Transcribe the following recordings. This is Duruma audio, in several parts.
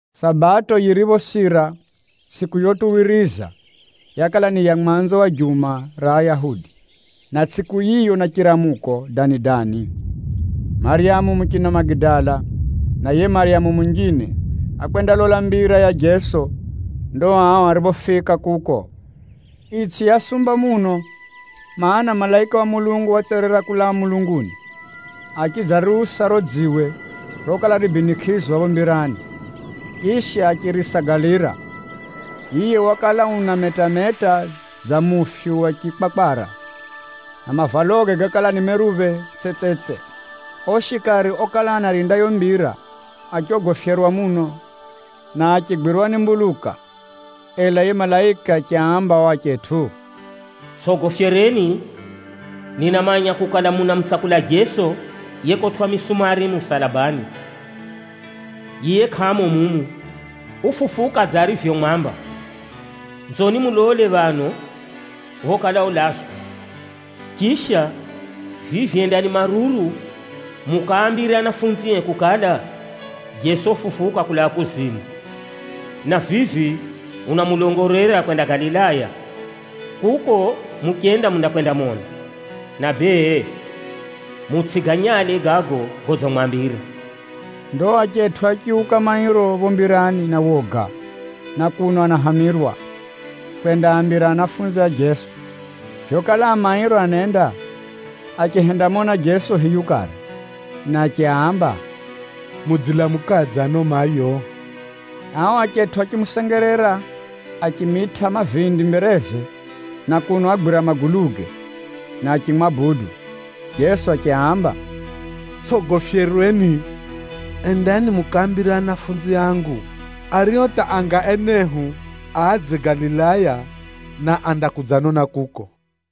Sabato yiriphosira, tsʼiku yotuwiriza yakala ni ya mwanzo wa juma ra Ayahudi, na tsʼiku yiyo na chiramuko dani-dani, Maryamu muchina Magidala na yiye Maryamu munjine, ákwendalola mbira ya Jeso. Ndo ao ariphofika kuko, itsʼi yasumba muno, mana, malaika wa Bwana watserera kulaa mulunguni, achidzariusa riro dziwe rokala ribinikʼizwa phapho mbirani, chisha achirisagalira. Yiye wakala unameta-meta dza mufyu wa chikwakwara, na mavaloge gakala ni meruphe tsetsetse. Ao shikari okala anarinda yiyo mbira achogofyerwa muno, na achigwirwa ni mbuluka. Ela yiye malaika achiaamba ao achetʼu, “Tsʼogofyerweni! Ninamanya kukala munamutsakula Jeso yekotwʼa misumari musalabani. Yiye kʼamo mumu, ufufuka dza arivyomwamba. Nzoni mulole phano phokala ulazwa. Chisha, vivi endani maruru mukaambire anafunzie kukala, ‘Jeso ufufuka kulaa kuzimu, na vivi unamulongolera kwenda Galilaya. Kuko muchenda, mundakwendamona.’ Na bee, mutsʼiganyale gago godzimwambira.” Ndo achetʼu achiuka mairo phapho mbirani na woga na kuno anahamirwa, kwendaambira anafunzi a Jeso. Vyokala a mairo anenda, achihendamona Jeso hiyu kare, na achiaamba, “Mudzilamukadze ano mayo?” Ao achetʼu achimusengerera achimitʼa mavindi mbereze na kuno agwira maguluge, na achimwabudu. Jeso achiaamba, “Tsʼogofyerweni! Endani mukaambire anafunzi angu, ario hata anga enehu adze Galilaya, na andakudzanona kuko.”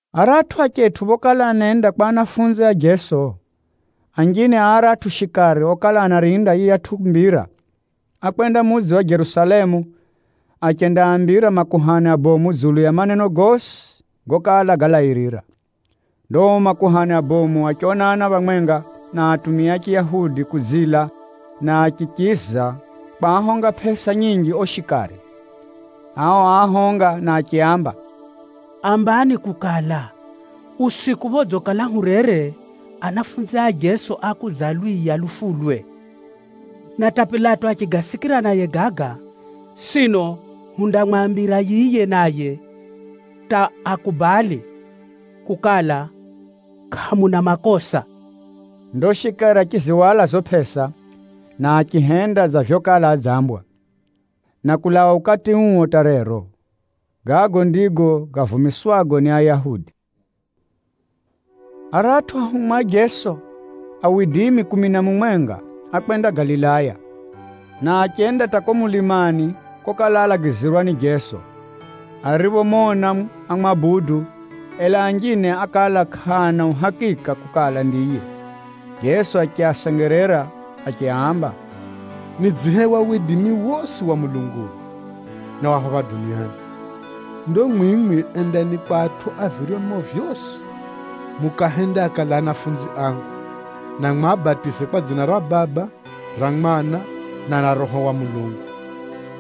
Aratʼu achetʼu phokala anenda kwa anafunzi a Jeso, anjine a aratʼu shikari okala anarinda yiyatʼu mbira, ákwenda mudzi wa Jerusalemu achendaambira makuhani abomu dzulu ya maneno gosi gokala galairira. Ndo ao makuhani abomu achionana phamwenga na atumia a Chiyahudi kudzila, na achichiza kwahonga pʼesa nyinji ao shikari. Ao áahonga na achiaamba, “Ambani kukala, ‘Usiku phodzikala hurere, anafunzi a Jeso ákudzalwiya lufulwe.’ Na hata Pilato achigasikira naye gaga, sino hundamwambira yiye naye hata akubali kukala kʼamuna makosa.” Ndo shikari achizihwala zizo pʼesa, na achihenda dza vyokala adzambwa. Na kulaa ukati uo hata rero, gago ndigo gavumiswago ni Ayahudi. Aratʼu anafunzi a Jeso kumi na mumwenga ákwenda Galilaya, na achenda hata kuko mulimani kokala álagizirwa ni Jeso. Ariphomona, ámwabudu, ela anjine ákala kʼaana uhakika kukala ndiye. Jeso achiasengerera achiaamba, “Nidzihewa widimi wosi wa mulunguni, na wa phapha duniani. Ndo mwimwi endani kwa atʼu a viryomo vyosi, mukaahende akale anafunzi angu, na mwabatize kwa dzina ra Baba, ra Mwana na ra Roho wa Mulungu.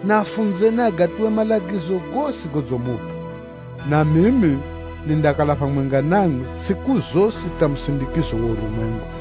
Na afunzeni agatuwe malagizo gosi godzimupʼa. Na mimi nindakala phamwenga namwi tsʼiku zosi hata musindikizo wa urumwengu.”